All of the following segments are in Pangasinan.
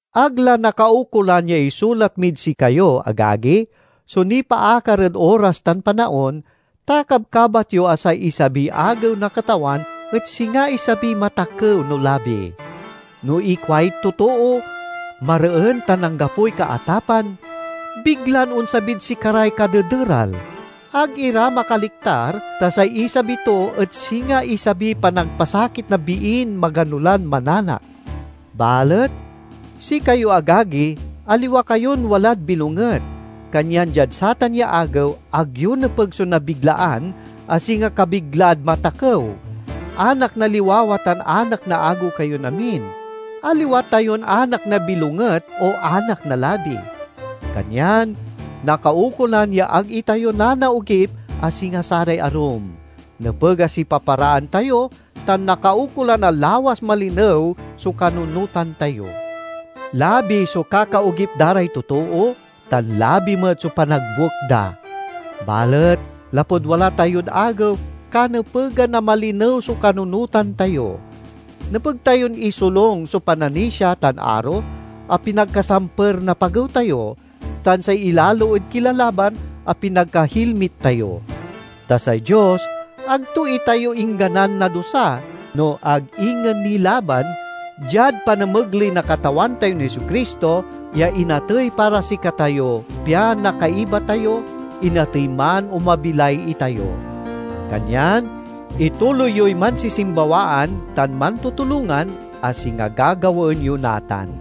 Ag la nakaukolan ya isulat mid sikayo, agagi, so nipaakar ed oras tan panaon, ta kabkabat yo a say isabiy Agew na Katawan et singa isabiy matakew no labi. No ikuay totoo, "Mareen tan anggapoy kaatapan," biglan onsabid sikaray kadederal. Ag ira makaliktar ta say isabi to et singa isabiy panagpasakit na biin magano lan mananak. Balet sikayo, agagi, aliwa kayon walad bilonget, kanyan diad satan ya Agew, ag yo nepeg so nabiglaan a singa kabiglaad matakew. Anak na liwawa tan anak na agew kayon amin. Aliwa tayon anak na bilonget o anak na labi. Kanyan nakaukolan ya ag itayo nanaogip a singa saray arum; nepeg a sipaparaan tayo tan nakaukolan a lawas malinew so kanunotan tayo. Labi so kakaogip da ray totoo, tan labi met so panagbuek da. Balet lapud wala tayod agew, kanepegan a malinew so kanunotan tayo. Nepeg tayon isolung so pananisia tan aro a pinagkasamper na pagew tayo, tan say ilalo ed kilalaban a pinagkahilmit tayo. Ta say Dios ag to itayo ingganan nadusa, no ag ingen nilaban, diad panamegley na Katawan tayon Jesu-Cristo, ya inatey para sikatayo pian nakaiba tayo, inatey man o mabilay itayo. Kanyan ituloy yoy mansisimbawaan tan mantutulongan, a singa gagawaen yo natan.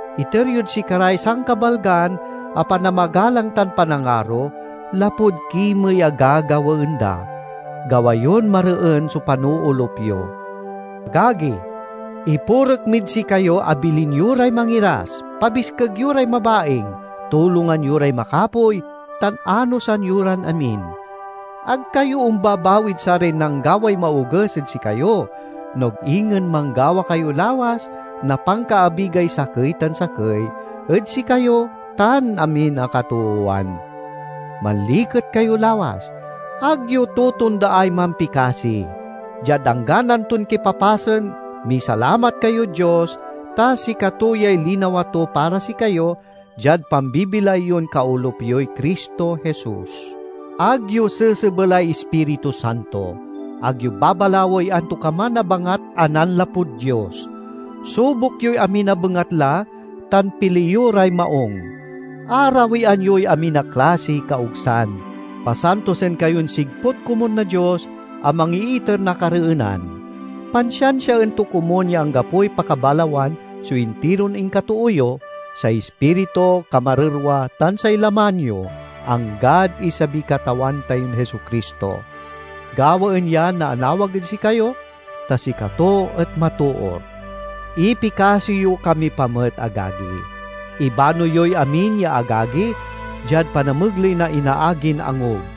Iter yod sikaray sankabalgan a panamagalang tan panangaro lapud kimey a gagawaen da. Gawa yon mareen so panoolup yo. Agagi, ipurek mid sikayo a bilin yo ray mangiras, pabiskeg yo ray mabaing, tulongan yo ray makapoy, tan anosan yo ran amin. Ag kayo ombabawid saray nanggaway maoges ed sikayo, no ag ingen manggawa kayo lawas na pankaabigay sakey tan sakey ed sikayo tan amin a katoowan. Manliket kayo lawas. Ag yo totondaay mampikasi. Diad anggan anton kipapasen misalamat kayod Dios, ta sikato yay linawa to para sikayo, diad pambibilay yon kaolup yoy Cristo Jesus. Ag yo sesebelay Ispiritu Santo. Ag yo babalawey antokaman a bangat a nanlapud Dios. Subok yoy amin a bengatla tan pili yo ray maung. Arawian yoy amin a klasiy kaogsan. Pasantosen kayon sigput komun na Dios a mangiiter na kareenan. Pansiansiaen to komun ya anggapoy pakabalawan so intiron inkatoo yo—say ispiritu, kamarerwa, tan say laman yo—anggad isabiy Katawan tayon Jesu-Cristo. Gawaen ya na anawag ed sikayo, ta sikato et matoor! Ipikasi yo kami pa met, agagi. Ibano yoy amin ya agagi, diad panamegley na inaagin angub.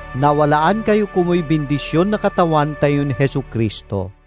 Nawalaan kayo komuy bindision na Katawan tayon Jesu-Cristo.